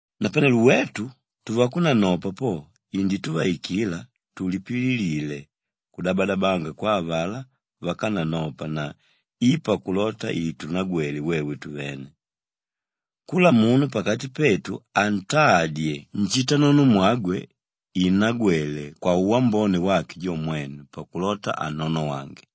Napanelo wetu tuvakunanopa po indituvaikila tulipililile kudabadabanga kwa avalá vákananopa na i pakulota itunagwele wewe tuvene. Kula munu pakati petu antadye nshitanonomwagwe innagwele kwauwambone wake jo mwene pakulota annonowange.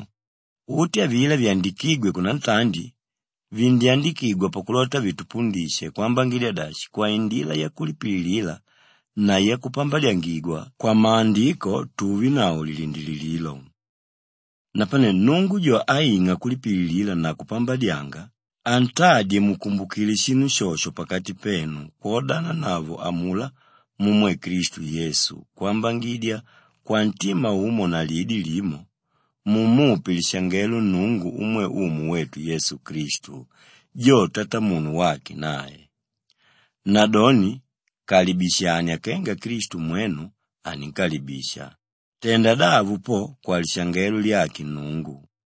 Mwenu, uti avilá vyandikígwe kunantandi, vindyandikigwa pakulota vitupundishe kwambangidya dashi kwaindila yakulipililila na yakupambadyangigwa kwamaandiko tuvenavo lilindilililo. Napane Nnungu jo áing'a kulipililila na kupambadyanga, antadye mukumbukile shinu shosho pakati penu kwodananavo amulá mumwe Klistu Yesu kwambangidya kwantima umo na lidi limo, mumupe lishangelo Nnungu umwe Umu wetu Yesu Klistu jo Tatamunu wake nae. Nadoni kalibishania kenga Klistu mwenu aninkalibisha, tenda davo po kwalishangelo lyake Nnungu.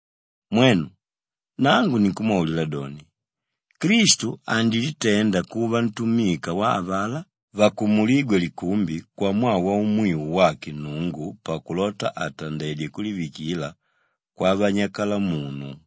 Mwenu, nangu ninkumwaulila doni, Klistu andilitenda kuva ntumika wa avalá vakumulígwe likumbi kwamwaa waumwiu wake Nnungu pakulota atandedye kulivikila kwavanyakalamunu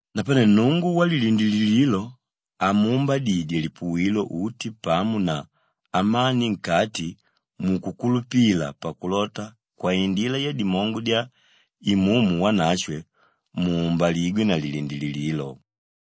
Napane Nnungu walilindilililo amuumbadye lipuwilo uti pamo na amani nkati mukukulupila pakulota kwaindila yadimongo dya Imumu Wanashwe, muumbaligwe na lilindilililo.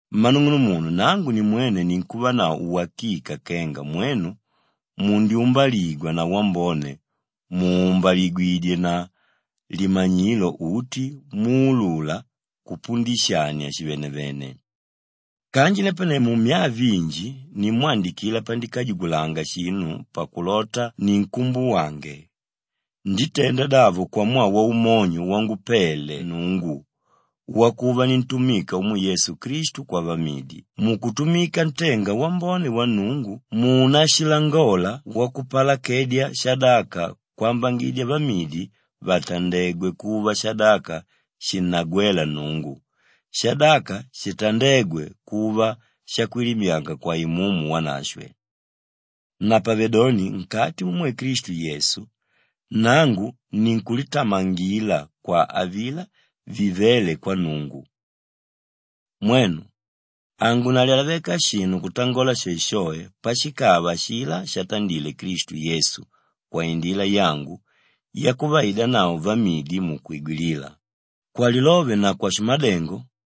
Mmanung'unumunu nangu nimwene ninkuvanavo wakika kenga mwenu mundyumbaligwa na wambone mùumbaligwidye na limanyilo uti muulula kupundishania shivanavene. Kanji napane mumyaa vinji nimwandikila pandikajugulanga shinu pakulota ninkumbuwange. Nditenda davo kwamwaa waumonyo wangupele Nnungu wakuva nintumika umwe Yesu Klistu kwavamidi mukutumika ntenga wambone wa Nnungu muunashilangola wakupalakedya shadaka kwambangidya vamidi vatandegwe kuva shadaka shinnagwéla Nnungu, Kwali: …kwambangidya shadaka shavamidi shikubaligwe. shadaka shitandégwe kuva shakwilimyanga kwa Imumu Wanashwe. Napavedoni nkati mumwe Klistu Yesu, nangu ninkulitamangila kwa avilá vivéle kwa Nnungu. Mwenu, hangunalyalaveka shinu kutangola shoeshoe pashikava ashilá shatandile Klistu Yesu kwaindila yangu yakuvaidanavo vamidi mukwigwilila; kwalilove na kwashimadengo,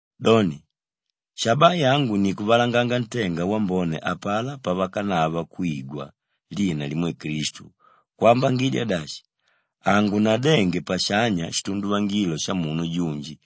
Doni, shabaa yangu ni kuvalanganga ntenga wambone apalá pavakanava kwigwa lina limwe Klistu kwambangidya dashi, hangunadenge pashanya shitunduvangilo shamunu junji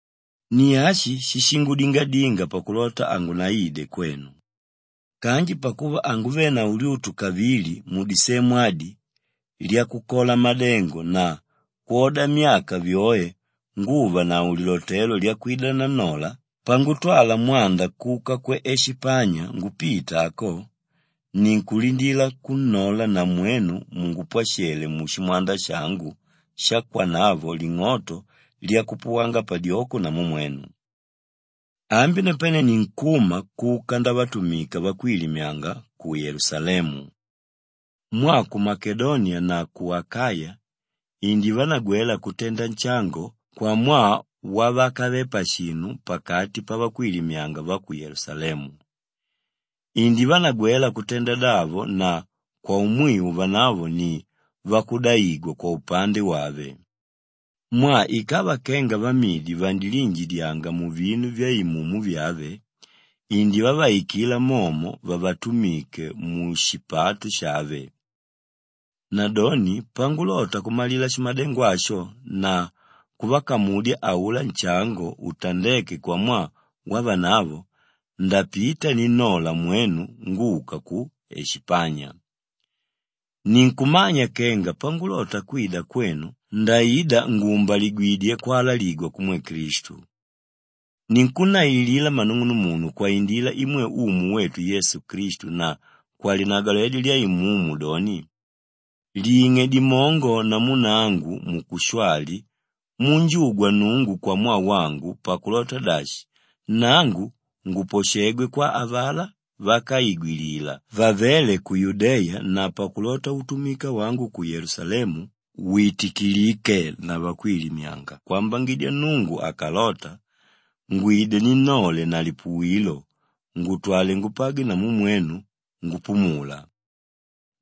Ni ashi shíshingudingadinga pakulota hangunaide kwenu. Kanji pakuva hanguvenavo lyutu kavili mudisemu adi lyakukola madengo na kwoda myaka vyoe nguvanavo lilotelo lyakwida nannola, pangutwala mwanda kuka ku Eshipanya ngupita ako, ninkulindila kunnola na mwenu mungupwashele mushimwanda shangu shakwanavo ling'oto lyakupuwanga padyoko namu mwenu. Ambi napane ninkuma kuka ndavatumika vakwilimyanga ku Yelusalemu. Mwaa ku Makedoniya na ku Akaya indivanagwela kutenda nshango kwamwaa wavakave pashinu pakati pavakwilimyanga va ku Yelusalemu. Indivanagwela kutenda davo na kwaumwiu vanavo ni vakudaigwa kwaupande wave. Mwaa ikava kenga vamidi vandiliinjidyanga muvinu vyaimumu vyave, indivavaikila momo vavatumike mushipato shave. Nadoni pangulota kumalila shimadengo asho na kuvakamudya aulá nshango utandéke kwamwaa wavanavo, ndapita ninnola mwenu nguka ku Eshipanya. Ninkumanya kenga pangulota kwida kwenu ndaida nguumbaligwidye kwalaligwa kumwe Klistu. Ninkunnaililila mmanung'unumunu kwaindila imwe Umu wetu Yesu Klistu na kwalinagwaledyo lya Imumu doni, ling'e dimongo namu nangu mukushwali munjugwa Nnungu kwamwaa wangu pakulota dashi, nangu nguposhegwe kwa avalá vákaigwilila vavéle ku Yudeya na pakulota utumika wangu ku Yelusalemu witikilike na vakwilimyanga kwambangidya Nnungu akalota, ngwide ninnole na lipuwilo ngutwale ngupagwe namu mwenu ngupumula.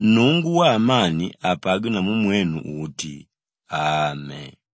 Nnungu waamani apagwe namu mwenu uti. Ame.